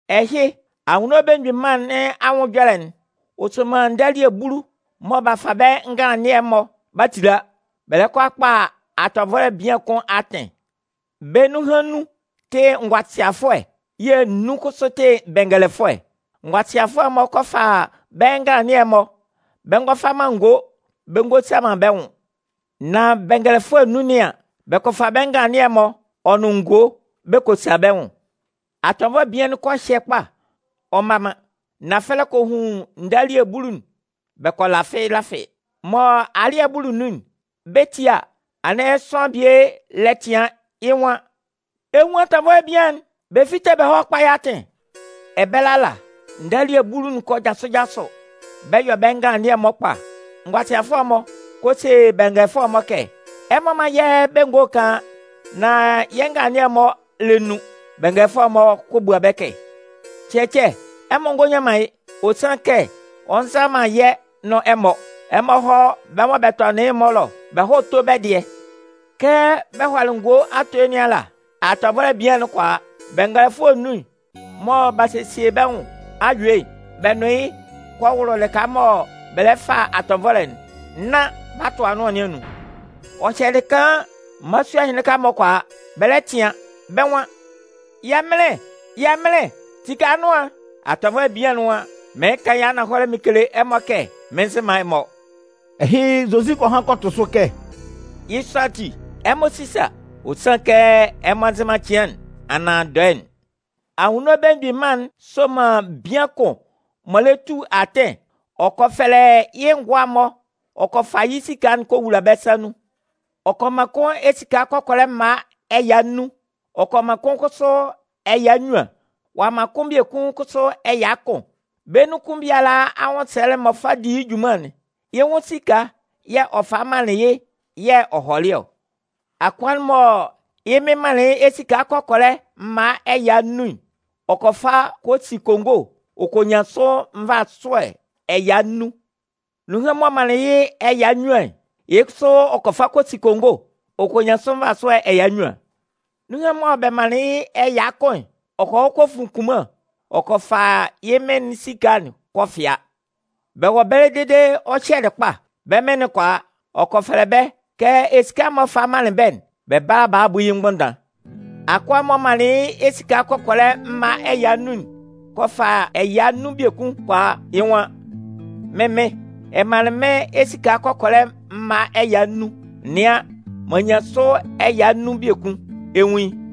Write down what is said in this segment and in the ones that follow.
“Ɛhɩ, Anwunno Belemgbin Mân nɩn anwʋn ɛjɔlɛ'n, ɔ soman ndalie bulu mɔ b'a fa bɛ́ nganlannɩɛ'n-mɔ b'a tetila, bɛ lɛ kɔ a kpa atɔnvɔlɛ bian kʋn atɩn. Bɛ́ nunhan nnun tɩ ngʋasɩafʋɛ yɛ̂ nnun kʋsʋ tɩ bɛngɛlɛfʋɛ. Ngʋasɩafʋɛ'n-mɔ kɔ fa bɛ́ nganlannɩɛ'n-mɔ, bɛ ngɔ fa man ngo bɛ ngɔ sa man bɛ́ nwʋn. Nan bɛngɛlɛfʋɛ nnun nɩn an, bɛ kɔ fa bɛ́ nganlannɩɛ'n-mɔ ɔ nʋn ngo ɛsɛ̂ nun bɛ kɔ sa bɛ́ nwʋn. Atɔnvɔlɛ bian'n kɔ hyɛ kpa, ɔ mma man. Nafɛlɛ kɔ hun ndalie bulu'n bɛ kɔ lafɩ lafɩ. “Mɔ alɩ́ɛ'n buli nun'n, bɛ 'tie a, anɩn sʋanlan bie lɛ tɩan, yɩ́ nwan: ‘Ɛ 'nwun atɔnvɔlɛ bian'n! Bɛ fíte bɛ hɔ́ kpá yɩ́ atɩn!’ “Ɛbɛlɛ ala, ndalie bulu'n kɔ jasʋ jasʋ, bɛ yɔ bɛ́ nganlannɩɛ'n-mɔ kpa. Ngʋasɩafʋɛ'n-mɔ kɔ se bɛngɛlɛfʋɛ'n-mɔ kɛ: ‘Ɛmɔ mán yɛ́ bɛ́ ngo'n kaan, nán yɛ́ nganlannɩɛ'n-mɔ lɛ nun.’ “Bɛngɛlɛfʋɛ'n-mɔ kɔ bua bɛ́ kɛ: ‘Cɛcɛ, ɛmɔ ngɔ nyan man yɩ́, ɔ sanlɩn kɛ, ɔ nza man yɛ́ nʋn ɛmɔ. Ɛmɔ hɔ́ bɛ́ mɔ bɛ tɔnɩn yɩ́'n-mɔ ɛlɔ, bɛ hɔ́ tó bɛ́ dɩɛ.’ “Kɛ bɛ hɔlɩ ngo atoe nɩn ala, atɔnvɔlɛ bian'n kɔ a. Bɛngɛlɛfʋɛ nnun'n, mɔ b'a sesie bɛ́ nwʋn a yue'n, bɛ nʋn yɩ́ kɔ wʋlʋ lɩka mɔ bɛ lɛ fa atɔnvɔlɛ'n, nán b'a tʋ anʋan nɩn anun. “Ɔ hyɛlɩ kaan, mmalasua ɛhɩnlɩn-mɔ kɔ a, bɛ lɛ tɩan, bɛ́ nwan: ‘Yɛmɩnlɩn, yɛmɩnlɩn, tike anʋan'n!’ “Atɔnvɔlɛ bian'n nwan: ‘Mɩɩn kan yɩ́ ananhɔlɛ mɩn kele ɛmɔ kɛ mɩn nzɩ man ɛmɔ.’” Ɛhɩ, Zozi kɔ han kɔ tʋ sʋ kɛ: “Yɩ́ sɔ ati, ɛmɔ sísa, ɔ sanlɩn kɛ ɛmɔ nzɩ man cɩan'n, anaan dɔɛ'n.” “Anwunno Belemgbin Mân'n soman bian kʋn m'ɔ lɛ ba tu atɩn. Ɔ kɔ fɛfɛlɛ yɩ́ ngʋa'n-mɔ ɔ kɔ fa yɩ́ esika'n kɔ wowula bɛ́ sa nun. Ɔ kɔ man kʋn esika kɔkɔlɛ mma ɛya nnun, ɔ'a man kʋn kʋsʋ ɛya nnyuan, ɔ'a man kʋn biekun kʋsʋ ɛya kʋn. Bɛ́ nun kʋn biala anwʋnsɛlɛ'n m'ɔ fa di yɩ́ junman'n, yɩ́ nwʋn esika yɛ̂ ɔ falɩ manlɩn yɩ́, yɛ̂ ɔ hɔlɩ ɔ. Akʋa'n mɔ yɩ́ mɩn'n manlɩn yɩ́ esika kɔkɔlɛ mma ɛya nnun'n, ɔ kɔ fa kɔ si kongo, ɔ kɔ nyan sʋ nvasʋɛ ɛya nnun. Nunhan'n mɔ bɛ manlɩn yɩ́ ɛya nnyuan'n, yɩ́ kʋsʋ ɔ kɔ fa kɔ si kongo, ɔ kɔ nyan sʋ nvasʋɛ ɛya nnyuan. Nunhan'n mɔ bɛ manlɩn yɩ́ ɛya kʋn'n, ɔ kɔ hɔ kɔ fun kunman ɔ kɔ fa yɩ́ mɩn esika'n kɔ fɩa. “Bɛ wɔ ɛbɛlɛ dede ɔ hyɛlɩ kpa, bɛ́ mɩn'n kɔ a, ɔ kɔ fɛfɛlɛ bɛ́ kɛ esika'n m'ɔ falɩ manlɩn bɛ́'n, bɛ bála a bu yɩ́ mgbʋnndan. Akʋa'n mɔ bɛ manlɩn yɩ́ esika kɔkɔlɛ mma ɛya nnun'n kɔ fa ɛya nnun biekun kɔ a, yɩ́ nwan: ‘Mɩ́n mɩn, ɛ manlɩn mɩ́n esika kɔkɔlɛ mma ɛya nnun. Nɩan, m'an nyan sʋ ɛya nnun biekun, ɛ 'nwun yɩ́.’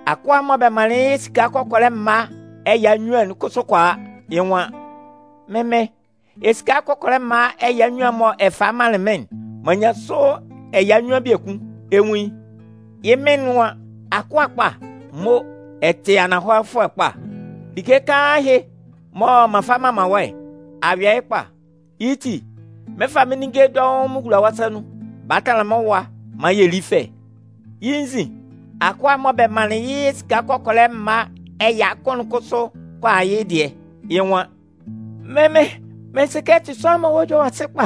“Akʋa'n mɔ bɛ manlɩn yɩ́ esika kɔkɔlɛ mma ɛya nnyuan'n kʋsʋ kɔ a, yɩ́ nwan: ‘Mɩ́n mɩn, esika kɔkɔlɛ mma ɛya nnyuan'n mɔ ɛ falɩ manlɩn mɩ́n'n, m'an nyan sʋ ɛya nnyuan biekun, ɛ 'nwun yɩ́.’ “Yɩ́ mɩn'n nwan: ‘Akʋa kpa, mo! Ɛ tɩ ananhɔlɛfʋɛ kpa. Like kaan ɛhɩ mɔ m'an fa m'an man wɔ́'n, a yɔ yɩ́ kpa. Yɩ́ ti, mɩn 'fa ninnge dɔʋn mɩn wula wɔ́ sa nun. Bala tanlan mɩ́n nwʋn ɛwa maan yɛ lí fɛ.’ “Yɩ́ nzin, akʋa'n mɔ bɛ manlɩn yɩ́ esika kɔkɔlɛ mma ɛya kʋn'n kʋsʋ kɔ a yɩ́ dɩɛ. Yɩ́ nwan: ‘Mɩ́n mɩn, mɩn sɩ kɛ ɛ tɩ sʋanlan mɔ wɔ́ ɛjɔlɛ yɔ sɩ kpa.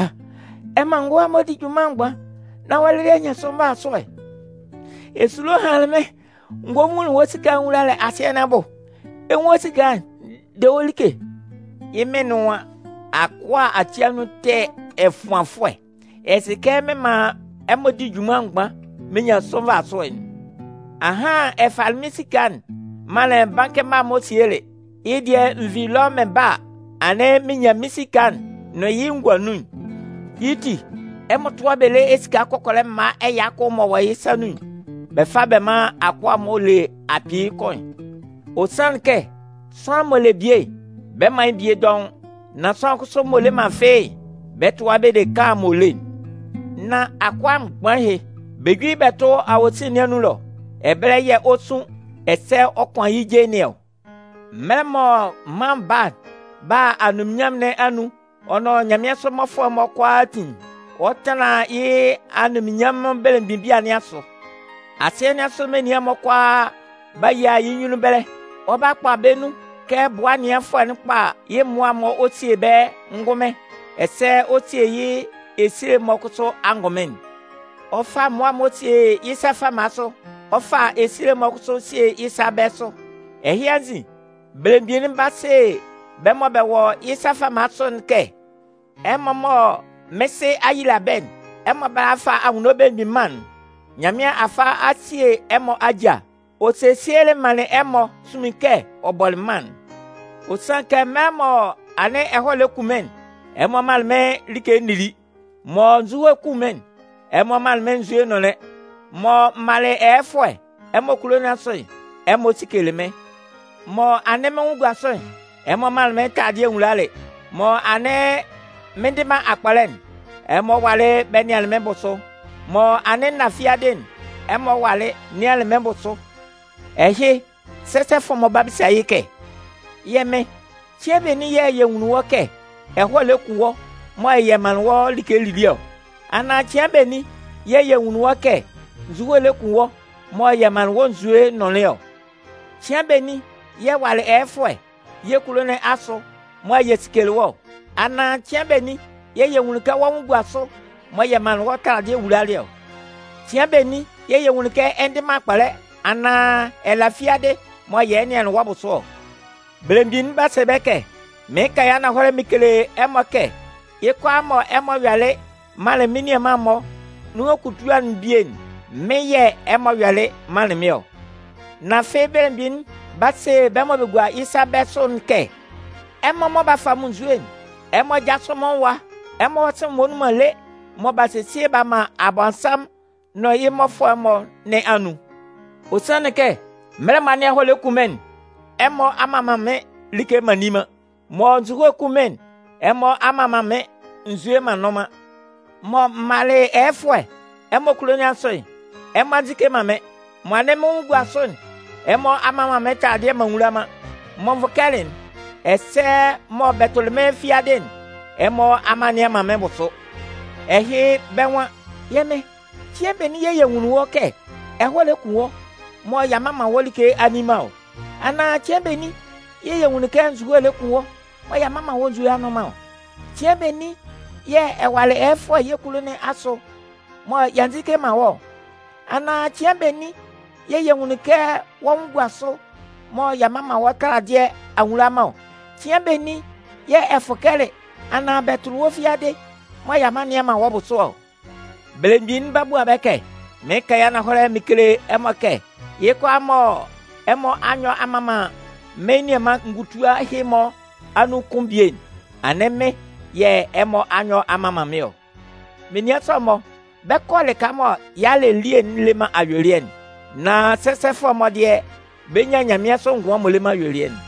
Ɛ man ngʋa'n-mɔ di junman mgban nán wɔ́ lɩlɩ a nyan sʋ nvasʋɛ'n. Esulo hanlɩn mɩ́n, n gɔ n vunlin wɔ́ esika'n n wulalɩ asɩɛ bʋ. Ɛ 'nwun wɔ́ esika'n, de wɔ́ like.’ “Yɩ́ mɩn'n nwan: ‘Akʋa ati anun ɛtɛ ɛfʋanfʋɛ, ɛ sɩ kɛ mɩn man ɛmɔ di junman mgban mɩn nyan sʋ nvasʋɛ'n. Ahan ɛ falɩ mɩn esika'n manlɩn bankɩ mma'n-mɔ sielɩ. Yɩ́ dɩɛ n vi ɛlɔ mɩn ba a, anɩn mɩn yɩ mɩ́n esika'n nʋn yɩ́ ngua nun'n. Yɩ́ ti, ɛmɔ tʋ́a yɩ́ bɛ lé esika kɔkɔlɛ mma ɛya kʋn'n m'ɔ wɔ yɩ́ sa nun'n, bɛ fá bɛ mán akʋa'n m'ɔ le akpɩɩ kʋn'n. Ɔ sanlɩn kɛ sʋanlan m'ɔ le bie'n, bɛ 'man yɩ́ dɔʋn biekun. Nan sʋanlan kʋsʋ m'ɔ le man fɩ́ɩ́'n, bɛ 'tʋa yɩ́ bɛ de kaan'n m'ɔ le'n. Nán akʋa mgban ɛhɩ, bɛ jú yɩ́ bɛ tʋ́ awosin nɩn anun ɛlɔ. Ɛbɛlɛ yɛ̂ ɔ 'sun ɛsɛ ɔ 'kʋan yɩ́ je nɩn ɔ.’ “Mɛlɛ mɔ Mân Baa'n ba a anunminnyanmʋn nɩn anun'n ɔ nʋn nyanmɩansʋ mmɔfʋɛ'n-mɔ kʋalaatin'n, ɔ 'tanlan yɩ́ anunminnyanmʋn belemgbin bia nɩn asʋ. Asɩɛ nɩn asʋ menian'n-mɔ kʋalaa 'ba yia yɩ́ nyunnun ɛbɛlɛ. Ɔ 'kpa bɛ́ nun kɛ bʋa ɛnɩanfʋɛ'n kpa yɩ́ mmʋa'n ɔ sie bɛ́ ngʋnmɩn ɛsɛ ɔ sie yɩ́ esile'n-mɔ kʋsʋ angʋnmɩn'n. Ɔ 'fa mmʋa'n-mɔ sie yɩ́ sa fama sʋ, ɔ 'fa esile'n-mɔ kʋsʋ sie yɩ́ sa bɛ̂ sʋ. “Ɛhɩ anzin, belemgbin'n 'ba se bɛ́ mɔ bɛ wɔ yɩ́ sa fama sʋ'n kɛ: ‘Ɛmɔ mɔ mɩ́n Sɩ a yeyila bɛ́'n, ɛmɔ bála a fa Anwunno Belemgbin Mân'n. Nyanmɩan a fa a sie ɛmɔ ajâ. Ɔ sesielɩ manlɩn ɛmɔ sunmin kɛ ɔ bɔlɩ mân'n. Ɔ sanlɩn kɛ mɛlɛ mɔ anɩn ɛhɔɛ lɛ kun mɩ́n'n, ɛmɔ manlɩn mɩ́n like n nili. Mɔ nzuhoe 'kun mɩ́n'n, ɛmɔ manlɩn mɩ́n nzue n nʋnlɩn. Mɔ m malɩ ɛyɛfʋɛ ɛmɔ kulo nɩn asʋ'n, ɛmɔ sikelɩ mɩ́n. Mɔ anɩn mɩ́n nwʋn gua sʋ'n, ɛmɔ manlɩn mɩ́n taladɩɛ n wulalɩ, mɔ anɩn mɩn ndɩ man akpɔlɛ'n, ɛmɔ walɩ bɛ nɩanlɩn mɩ́n bʋsʋ. Mɔ anɩn n na fiadɩ'n, ɛmɔ walɩ nɩanlɩn mɩ́n bʋ sʋ.’ “Ɛhɩ, sɛsɛfʋɛ'n-mɔ 'ba bisa yɩ́ kɛ: ‘Yɛ Mɩn, cɩan benin yɛ̂ yɛ nwunlin wɔ́ kɛ ɛhɔɛ lɛ kun wɔ́ mɔ yɛ manlɩn wɔ́ like lili ɔ? Anaan cɩan benin yɛ̂ yɛ nwunlin wɔ́ kɛ nzuhoe lɛ kun wɔ́ mɔ yɛ manlɩn wɔ́ nzue nʋnlɩn ɔ? Cɩan benin yɛ̂ ɛ walɩ ɛyɛfʋɛ yɛ́ kulo nɩn asʋ mɔ yɛ sikelɩ wɔ́ ɔ, anaan cɩan benin yɛ̂ yɛ nwunlin kɛ wɔ́ nwʋn gua sʋ mɔ yɛ manlɩn wɔ́ taladɩɛ wulalɩ ɔ? Cɩan benin yɛ̂ yɛ nwunlin kɛ ɛ ndɩ man akpɔlɛ anaan ɛ la fiadɩ mɔ yɛ nɩanlɩn wɔ́ bʋsʋ ɔ?’ “Belemgbin'n 'ba se bɛ́ kɛ: ‘Mɩɩn kan yɩ́ ananhɔlɛ mɩn kele ɛmɔ kɛ yɩ́ kʋalaa mɔ ɛmɔ yɔlɩ manlɩn mɩ́n nianman-mɔ nunhan kutua'n bie'n, mɩ́n yɛ̂ ɛmɔ yɔlɩ manlɩn mɩ́n ɔ.’ “Nan afɩ belemgbin'n 'ba se bɛ́ mɔ bɛ gua yɩ́ sa bɛ̂ sʋ'n kɛ: ‘Ɛmɔ mɔ b'a fa munnzue'n, ɛmɔ jásʋ mɩ́n nwʋn ɛwa. Ɛmɔ hɔ́ sɩ̂n'n m'ɔ nnun man lé, mɔ b'a sesie b'a man Abɔnsanmʋn nʋn yɩ́ mmɔfʋɛ'n-mɔ nɩn anun. Ɔ sanlɩn kɛ mɛlɛ mɔ anɩn ɛhɔɛ lɛ kun mɩ́n'n, ɛmɔ a mman man mɩ́n like m'an nni man. Mɔ nzuhoe 'kun mɩ́n'n, ɛmɔ a mman man mɩ́n nzue m'an nnʋn man. Mɔ m malɩ ɛyɛfʋɛ ɛmɔ kulo nɩn asʋ'n, ɛmɔ a nzike man mɩ́n. Mɔ anɩn mɩ́n nwʋn gua sʋ'n, ɛmɔ a mman man mɩ́n taladɩɛ m'an nwula man. Mɔ n vʋkɛlɩ'n, ɛsɛ mɔ bɛ tʋlɩ mɩ́n fiadɩ'n, ɛmɔ a nnɩan man mɩ́n bʋsʋ.’ “Ɛhɩ, bɛ́ nwan: ‘Yɛ́ Mɩn, cɩan benin yɛ̂ yɛ nwunlin wɔ́ kɛ ɛhɔɛ lɛ kun wɔ́ mɔ y'a mman man wɔ́ like a nni man ɔ? Anaan cɩan benin yɛ̂ yɛ nwunlin kɛ nzuhoe lɛ kun wɔ́ mɔ y'a mman wɔ́ nzue a nnʋn man ɔ? Cɩan benin yɛ̂ ɛ walɩ ɛyɛfʋɛ yɛ́ kulo nɩn asʋ mɔ y'a nzike man wɔ́ ɔ? Anaan cɩan benin yɛ̂ yɛ nwunlin kɛ wɔ́ nwʋn gua sʋ mɔ y'a mman man wɔ́ taladɩɛ a nwula man ɔ? Cɩan benin yɛ̂ ɛ fʋkɛlɩ anaan bɛ tʋlɩ wɔ́ fiadɩ mɔ y'a nnɩan man wɔ́ bʋsʋ ɔ?’ “Belemgbin'n 'ba bua bɛ́ kɛ: ‘Mɩɩn kan yɩ́ ananhɔlɛ mɩn kele ɛmɔ kɛ yɩ́ kʋalaa mɔ ɛmɔ a nyɔ a mman man mɩ́n nianman ngutua ɛhɩ-mɔ anun kʋn bie'n, anɩn mɩ́n yɛ̂ ɛmɔ a nyɔ a mman man mɩ́n ɔ.’ “Menian sɔ'n-mɔ, bɛ 'kɔ lɩka mɔ yalɛ elie'n le man ayuelɩɛ'n. Nan sɛsɛfʋɛ'n-mɔ dɩɛ, bɛ 'nyan nyanmɩansʋ ngʋan m'ɔ le man ayuelɩɛ'n.”